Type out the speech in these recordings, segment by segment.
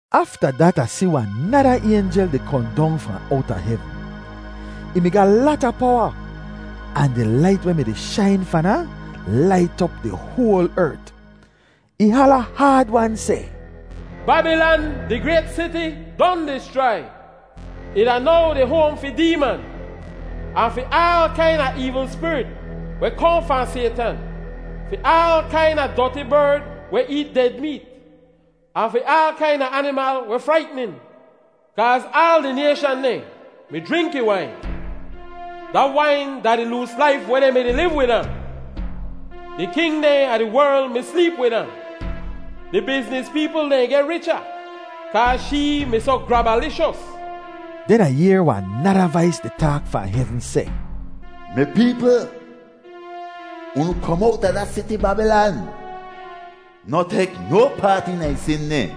Afta dat Ah si wahn nada aynjel di kohn dong fahn owta hevn. Ih mi ga lata powa, ahn di lait weh mi-di shain fahn ahn, lait op di hoal ert. Ih hala haad-wan seh, “Babilan di grayt siti don dischrai! Ih da now di hoam fi deeman, ahn fi aal kaina eevl spirit weh kohn fahn Saytan, fi aal kaina doti berd weh eet ded meet, ahn fi aal kaina animal weh fraitnin. Kaaz aal di nayshan dehn mi jrink ih wain. Da wain da di loos laif weh dehn mi-di liv wid ahn. Di king dehn a di werl mi sleep wid ahn. Di bizniz peepl dehn geh richa kaaz shee mi soh grabalishos.” Den Ah yehr wahn nada vais di taak fahn hevn seh, “Mi peepl, unu kom owta da siti Babilan! Noh tek no paat eena ih sin dehn,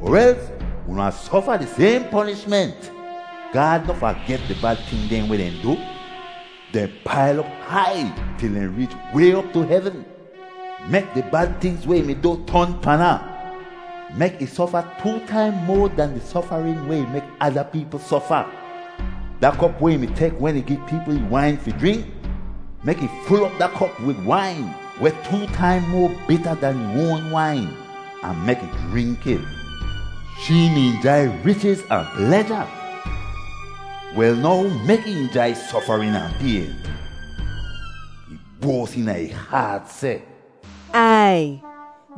er els unu wahn sofa di sayhn ponishment. Gaad noh faget di bad ting dehn weh dehn du; dehn pail op hai til dehn reech way op tu hevn. Mek di bad tingz weh ih mi du ton pan ahn. Mek ih sofa too taim moa dan di sofarin weh ih mek ada peepl sofa. Da kop weh ih mi tek wen ih gi peepl ih wain fi jrink, mek ih ful op da kop wid wain weh too taim moa bita dan ih oan wain, ahn mek ih jrink it. Shee mi injai richiz ahn pleja; wel now mek ih injai sofarin ahn payn. Ih boas eena ih haat seh, ‘Ai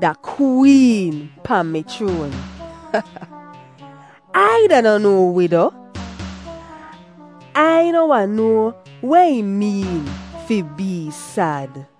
da kween pahn mi chroan! Ai da noh no wido; Ai noh wahn noa weh ih meen fi bee sad.’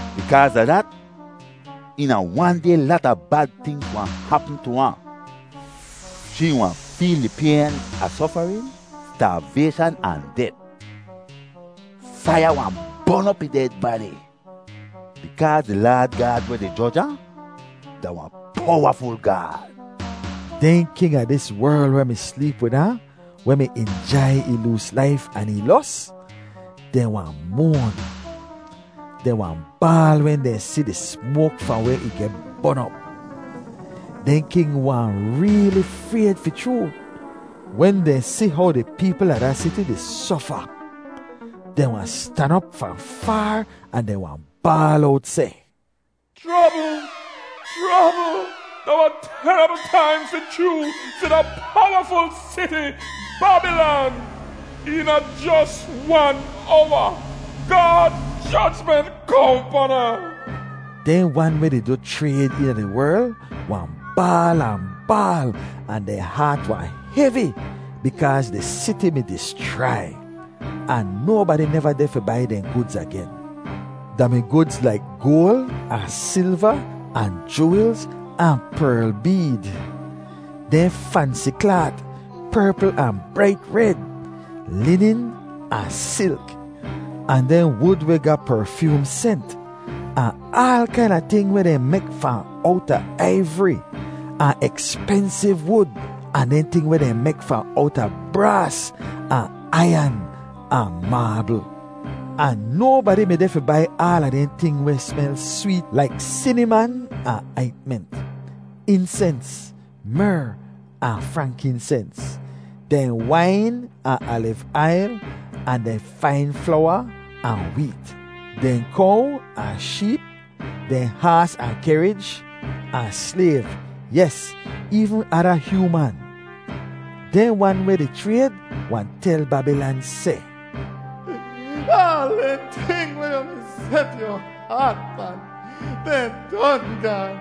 Bikaaz a dat, eena wan day lata bad tingz wahn hapm tu ahn. Shee wahn feel di payn a sofarin, staavayshan ahn det. Faiya wahn bon op ih ded badi bikaaz di Laad Gaad weh di joj ahn da wahn powaful Gaad.” Dehn king a dis werl weh mi sleep wid ahn weh mi injai ih loos laif ahn ih los, dehn wahn moan. Dehn wahn baal wen dehn si di smoak fahn weh ih geh bon op. Dehn king wahn reeli frayd fi chroo, wen dehn si how di peepl a da siti di sofa. Dehn wahn stan op fahn faar ahn dehn wahn baal owt seh, “Chrobl! Chrobl! Da wahn terabl taim fi chroo fi da powaful siti, Babilan. Eena jos wan owa Gaad jojment kohn pan ahn!” Dehn wan weh di du chrayd eena di werl wahn baal ahn baal ahn dehn haat wahn hevi bikaaz di siti mi dischrai, ahn nobadi neva deh fi bai dehn gudz agen. Da mi gudz laik goal ahn silva, ahn juwelz, ahn perl beed; dehn fansi klaat, perpl ahn brait red, linin ahn silk; ahn dehn wud weh ga perfyoom sent, ahn aal kaina ting weh dehn mek fahn owta aivri, ahn ekspensiv wud ahn dehn ting weh dehn mek fahn owta braas ahn aiyan ahn maabl. Ahn nobadi mi deh fi bai aala dehn ting weh smel sweet laik siniman ahn aintment, insens, mer ahn frankinsens; dehn wain ahn aliv ail, ahn dehn fain flowa ahn weet; dehn kow ahn sheep, dehn haas ahn kehrij, ahn slayv—yes, eevn ada hyooman. Dehn wan weh di chrayd wahn tel Babilan seh, “Aal dehn ting weh yu mi set yu haat pan, dehn don gaan.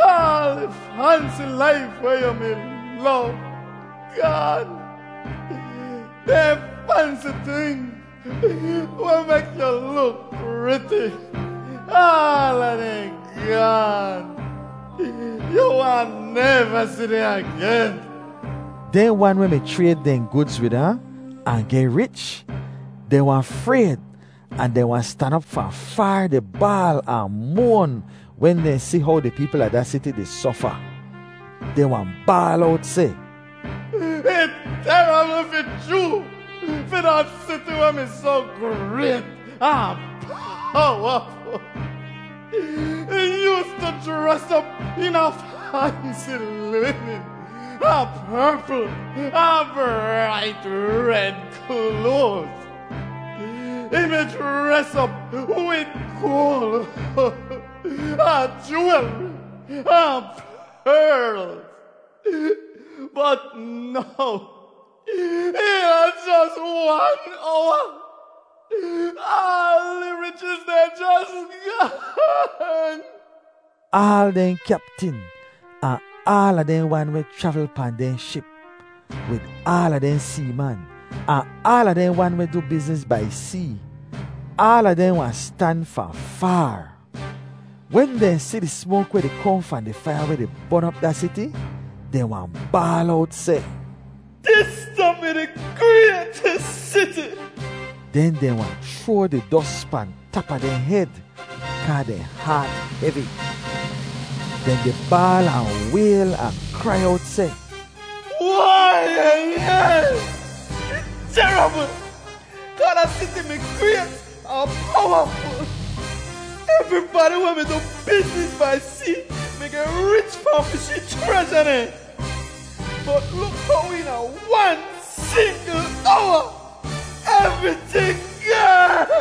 Aal di fansi laif weh yu mi lov, gaan. Dehn fansi ting weh mek yu luk priti, aala dehn gaan. Yu wahn neva si dehn agen!” Dehn wan weh mi chrayd dehn gudz wid ahn, ahn geh rich, dehn wahn frayd ahn dehn wahn stan op fahn faar di baal ahn moan wen dehn si how di peepl a da siti di sofa. Dehn wahn baal owt seh, “Ih terabl fi chroo fi da siti weh mi soh grayt ahn powaful. Ih yoostu jres op eena fansi linin, ahn perpl ahn brait red kloaz. Ih mi jres op wid goal, ahn juwelri, ahn perlz. Bot now eena jos wan owa aal ih richiz dehn jos gaan!” Aal dehn kyaptin ahn aala dehn wan weh chravl pahn dehn ship, wid aala dehn seeman, ahn aala dehn wan weh du bizniz bai see, aala dehn wahn stan fahn faar. Wen dehn si di smoak weh di kohn fahn di faiya weh di bon op da siti, dehn wahn baal owt seh, “Dis da-mi di graytis siti!” Den dehn wahn chroa di dos pahn tap a dehn hed kaa dehn haat hevi. Dehn di baal ahn wayl ahn krai owt seh, “Wai-ya-yaiy! Ih terabl, kaa da siti mi grayt ahn powaful. Evribadi weh mi du bizniz bai see mi geh rich fahn fi shee chreja dehn. Bot luk how eena wan singl owa evriting gaan.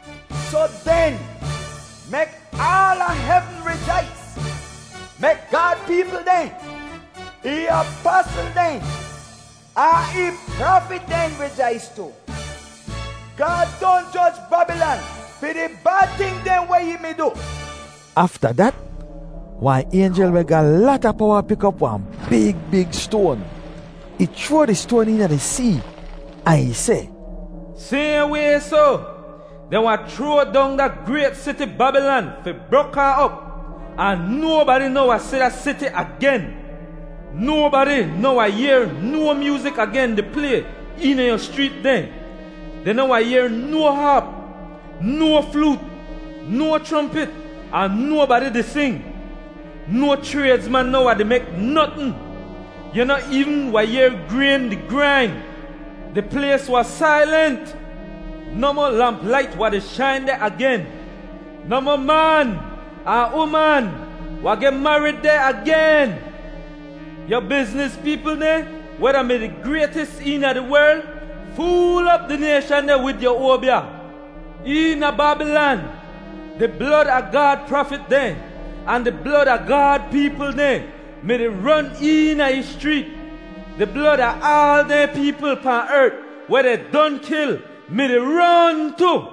Soh den, mek aala hevn rijais. Mek Gaad peepl dehn, ih apasl dehn, ahn ih prafit dehn rijais tu! Gaad don joj Babilan fi di bad ting dehn weh ih mi du.” Afta dat, wahn aynjel weh ga lata powa pik op wahn big big stoan. Ih chroa di stoan eena di see, ahn ih seh, “Sayhn way soh, dehn wahn chroa dong da grayt siti Babilan fi brok ahn op. Ahn nobadi noh wahn si da siti agen. Nobadi noh wahn yehr no myoozik agen di play eena yu schreet dehn. Dehn noh wahn yehr no haap, no floot, no chrompit, ahn nobadi di sing. No chraydzman noh wahn di mek notn. Yu noh eevn wahn yehr grayn di grain. Di plays wahn sailent. Nohmoh lamp lait wahn di shain deh agen. Nohmoh man ahn uman wahn geh marid deh agen. Yu bizniz peepl dehn weh da-mi di graytis eena di werl, fool op di nayshan dehn wid yu oabya. Eena Babilan, di blod a Gaad prafit dehn ahn di blod a Gaad peepl dehn mi-di ron eena ih schreet. Di blod a aal dehn peepl pahn ert weh dehn don kil mi-di ron tu.”